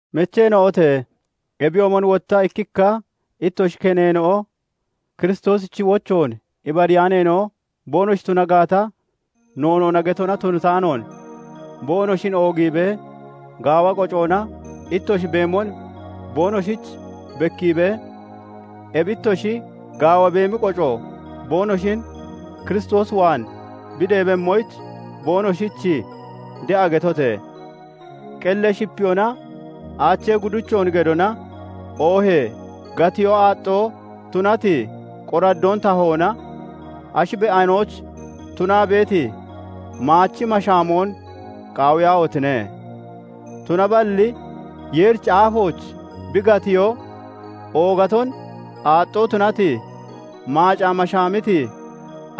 Mecheena'ote! Ebiyoomon wotta ikkikka ittoshi keneena'o Kiristoosichi wochoon ibariyaaneena'o boonoshi tuna gaata, noonoona getona tunataanoon, boonoshin oogiibee, gaawa qocoona ittoshi beemon boonoshich bekkiibee, ebi ittoshi gaawa beemi qoco boonoshin Kiristoos waan bi deebemmoyich boonoshich de'a getote! Qellee shipeyoonaa aachee gudichoon gedona oohee gatiyoo aaxxoo tunati qoraddoon tahoona ashi be'anoyich tunaa beeti maachi mashaamoon qaawiyaahotine! Tunaballi Yeerichi aafooch bi gatiyoo oogaton aaxxoo tunati maacaa mashaamiti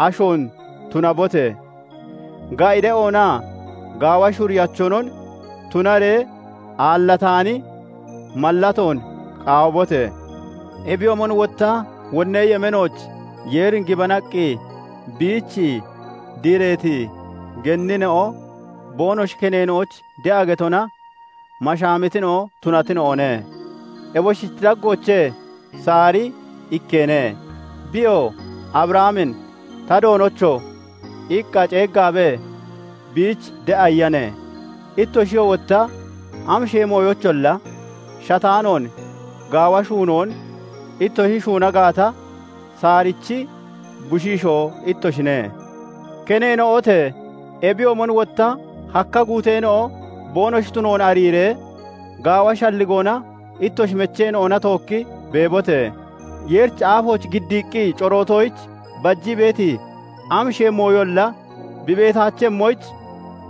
ashoon tunabote! Ga'i de'oonaa gaawa shuriyachonon tunaree aallataani mallatoon qaawibote! Ebiyoomon wotta wonnee yemeenooch Yeerin gibanaqqi biich diireeti genneena'o boonoshi keneena'oyich de'a getona mashaamitina'o tunatina'one. Eboshichi daggoochee Saari ikkeene; biyoo Abrahamin "Ta doonocho!" iqqa ceeggaabee biich de'a iyane. Ittoshiyoo wotta amashee mooyoyicholla shataanoon gaawa shuunoon ittoshi shuuna gaata, Saarichi bushiishoo ittoshine. Keneena'ote! Ebiyoomon wotta hakka guuteena'o boonoshi tunoon ariiree, gaawa shalligoona ittoshi mecheena'ona tookki beebote! Yeerichi aafooch giddaqqi corootoyich bajii beeti amashee mooyolla bi beetaachemmoyich,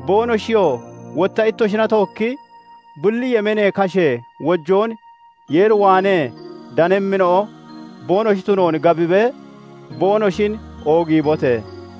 boonoshiyoo wotta ittoshina tookki bulli yemeenee kashee wojoon Yeer waanee danemmina'o boonoshi tunoon gabibee boonoshin oogiibote!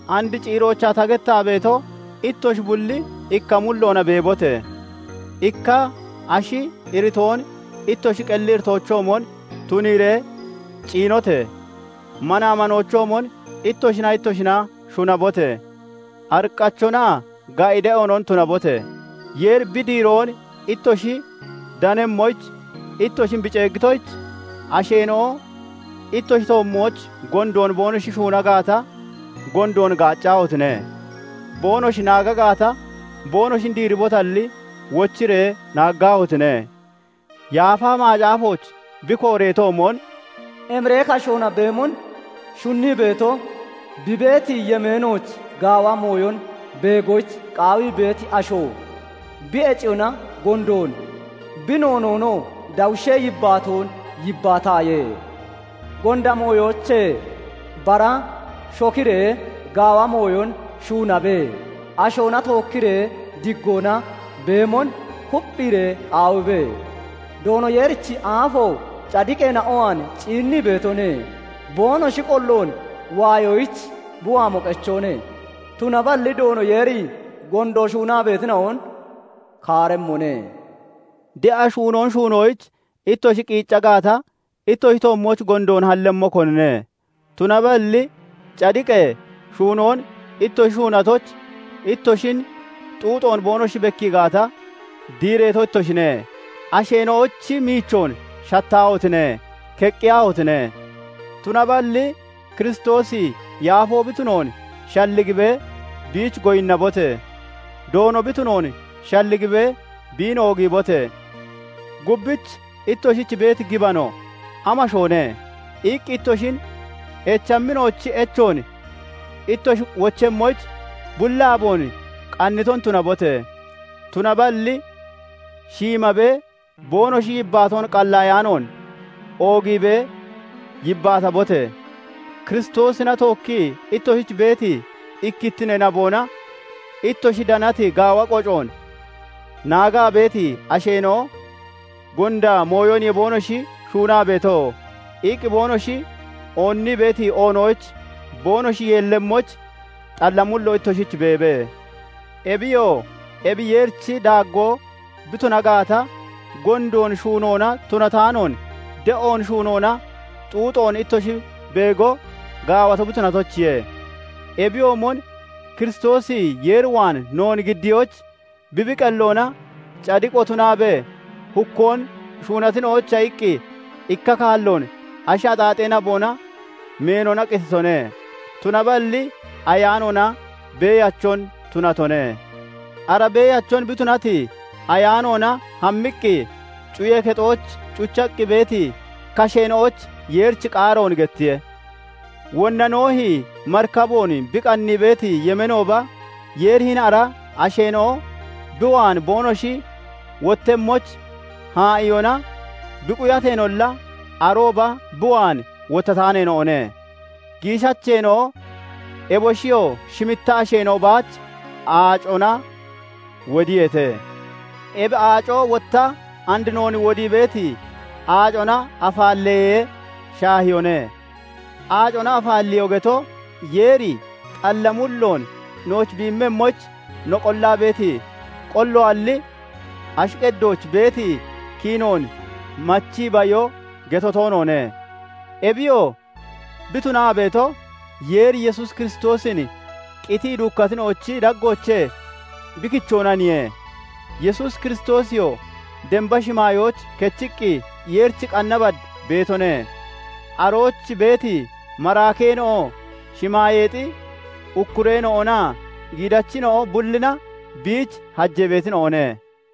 And ciiroochaa ta gettaa beeto, ittoshi bulli ikka mulloona beebote! Ikka ashi iritoon ittoshi qelli iritoochoomon tuniiree ciinote! Manaa manoochoomon ittoshinaa ittoshina shunabote! Ariqqachonaa ga'i de'oonon tunabote! Yeeri bi diiroon ittoshi danemmoyich ittoshin bi ceeggitoyich, asheena'o ittoshi toommooch gondoon boonoshi shuuna gaata, gondoon gaaccaahotine! Boonoshi naagi gaata, boonoshin diiribotalli, wochiree naaggaahotine! Yaafa Macaafooch bi kooreetoomon, "Emiree kashoona beemon shunnii beeto, bi beeti yemeenooch gaawa mooyon beegoyich qaawii beeti asho, bi heciyoona gondoon, bi noonoonoo dawushee yibbaatoon yibbaataaye; Gonda mooyoochee bara shokiree, gaawa mooyon shuunabe; ashoona tookkiree diggoona beemon kupphiiree qaawibe; Doono Yeerichi aafo cadiqeena'o waan ciinnii beetone; boonoshi qolloon waayoyich bi waamo qechoone; tunaballi Doono Yeeri gondoon shuunaa beetina'on kaaremmone." De'a shuunoon shuunoyich ittoshi qiicca gaata, ittoshi toommooch gondoon hallemmo konine? Tunaballi cadiqee shuunoon ittoshi shuunatoyich ittoshin xuuxoon boonoshi bekkii gaata, diireeto ittoshine. Asheena'ochi miichoon shattaahotine! Keqqiyaahotine! Tunaballi Kiristoosi yaafoo bi tunoon shalligibee biich goyinnabote! Doono bi tunoon shalligibee biin oogiibote! "Gubbich ittoshich beeti gibano amashoone?" iqqi ittoshin echammina'ochi echoon ittoshi wochemmoyich, bulli aaboon qanniton tunabote! Tunaballi shiimabee boonoshi yibbaatoon qallaayaanoon oogiibee yibbaatabote! Kiristoosina tookkii ittoshich beeti ikkittinee naboona ittoshi danati gaawa qocoon naagaa beeti asheena'o "Gonda mooyoniye boonoshi shuunaa beeto" iqqi boonoshi oonnii beeti oonoyich boonoshi yeellemmoyich, xalla mullo ittoshich beebe. Ebiyoo ebi Yeerichi daaggoo bi tuna gaata, gondoon shuunoona tunataanoon de'oon shuunoona xuuxoon ittoshi beego gaawato bi tunatoyichiye. Ebiyoomon Kiristoosi Yeer waan noon giddiyoyich, bi bi qelloona cadiqo tunaabee, hukkoon shuunatina'oyicha iqqi ikka kaalloon ashi axaaxee naboona meenona qititone; tunaballi ayaanoona beeyachon tunatone. Ara beeyachon bi tunati ayaanoona hammiqqi, cuyee kexooch cuchaqqi beeti kasheena'oyich Yeerichi qaaroon gettiye; wonna Noohi marikaboon bi qannii beeti yemeenooba, Yeeri hini ara asheena'o bi waan boonoshi wottemmoyich haa'iyoona bi quyateenolla, arooba bi waan wottataaneena'one; giishacheena'o, eboshiyoo shimitta asheena'o baach aacona wodiyeete. Ebi aaco wotta and noon wodii beeti, aacona afaalleyee shaahiyoone; aacona afaalleyoo geto, Yeer xalla mulloon nooch bi immemmoyich no qollaa beeti qolloalli, ashi qeddooch beeti kiinoon machii bayo geto toonoone; ebiyoo bi tunaa beeto, Yeeri Yesuus Kiristoosin qitii duukkatina'ochi daggoochee bi kichoonaniye. Yesuus Kiristoosiyoo damba shimaayooch kechiqqi Yeerichi qanna bad beetone; arooch beeti maraakeena'o, shimaayeexi ukkureena'onaa giidachina'o bullina biich hajee beetina'one.